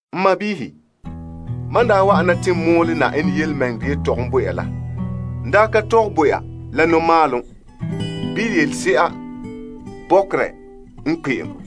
N sɔɔnrɔ, mam n daa wa'ana te n mɔɔlɛ Na'ayenɛ yelemɛŋɛrɛ yetɔgom bo ya la, n daa ka tɔgɛ bo ya la nɔmalehom, bii yelese'a bɔkerɛ n kpe'em.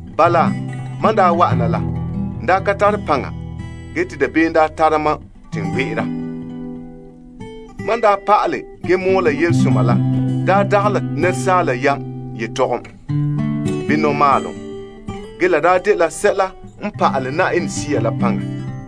Bala, mam n daa wa'ana la, n ka tare paŋa ge te dabeem daa tara mam te n gbe'era. Mam n pa'ale ge mɔɔla yelesoma la daa dagɛ la asaala yam yetɔgom, bii nɔmalehom. Ge la dela sɛla n pa'ale Yenɛ Sea la paŋa.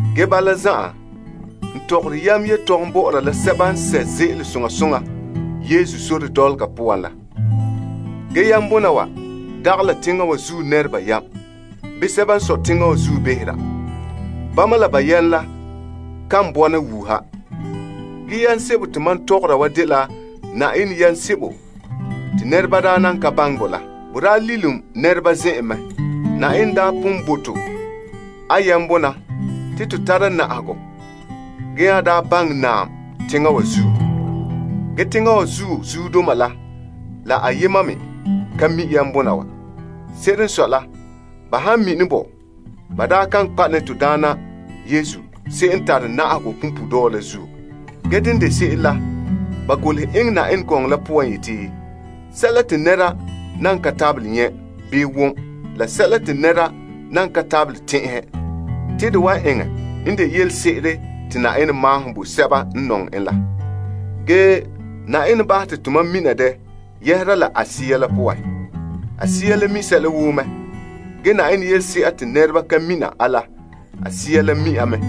Ge bala zan'an, n tɔgɔre yam yetɔgom bɔ'ɔra la sɛba n sɛ' ze'ele soŋa soŋa Yesu sore dɔlɔga poan la. Ge yambona wa dagɛ la teŋa wa zuo nɛreba yam, bii sɛba n sɔe teŋa wa zuo behera. Bama la ba yam la kan bɔna wuuha. Ge yam sebo te mam tɔgɔra wa dela Na'ayenɛ yam sebo te nɛreba daa nan ka baŋɛ bɔ la. Bo daa lilom nɛreba zen'en mɛ. Na'ayenɛ daa pon bo to a yambona te to tara na'ahegɔ ge nya daa baŋɛ naam teŋa wa zuo. Ge teŋa wa zuo zuodoma la, la ayema me ka mi' yambona wa. Se'ere n sɔe la, ba han mini bɔ, ba daa kan kpa' ne to Daana Yesu se'em n tare na'ahegɔ punpuuredɔɔ la zuo. Ge dene n de se'em la, ba golehɛ yeti, Sɛla te nɛra nan ka tabelɛ nyɛ', bii wom, la sɛla te nɛra nan ka tabelɛ tɛn'ɛhɛ, te de wa eŋɛ n de yelese'ere te Na'ayenɛ maahom bo sɛba n nɔŋɛ en la. Ge Na'ayenɛ bahɛ te tomam mina dɛ yɛhera la a Sea la poan. A Sea la mi' sɛla woo mɛ. Ge Na'ayenɛ yelese'a te nɛreba ka mina a la, a Sea la mi' a mɛ.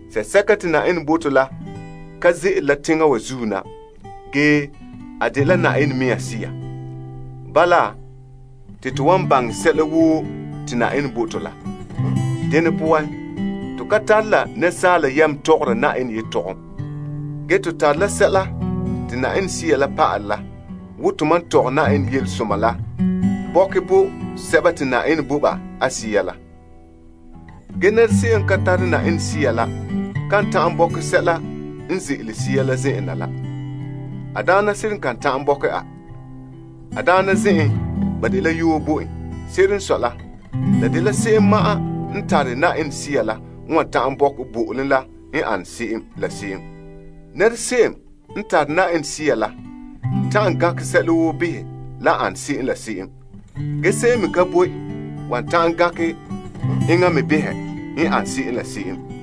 Sea sɛka te Na'ayenɛ bo to la ka ze'ele la teŋa wa zuo na, ge a dela Na'ayenɛ mea Sea. Bala, te to wan baŋɛ sɛla woo te Na'ayenɛ bo to la. Dene poan, to ka tare la asaala yam tɔgɔra Na'ayenɛ yɛla. Ge to tare la sɛla te Sea la pa'alɛ la wo tomam tɔgɛ Na'ayenɛ yelesoma la bɔkɛ bo sɛba te Na'ayenɛ bo ba a Sea la. Ge se'em n ka tare Yenɛ Sea la kan ta'an bɔkɛ sɛla n ze'ele Sea la zen'en na la. A daana seren kan ta'an bɔkɛ a. A daana zen'en, ba dela yoo bo en. Se'ere n sɔe la, la dela se'em ma'an n tare Yenɛ Sea la n wan ta'an bɔkɛ bo'olom la n ane se'em. Se'em n tare Yenɛ Sea la n ta'an gankɛ sɛla woo behɛ lan ane se'em. Ge se'em me ka boe wan ta'an gankɛ enŋa me behɛ n ane se'em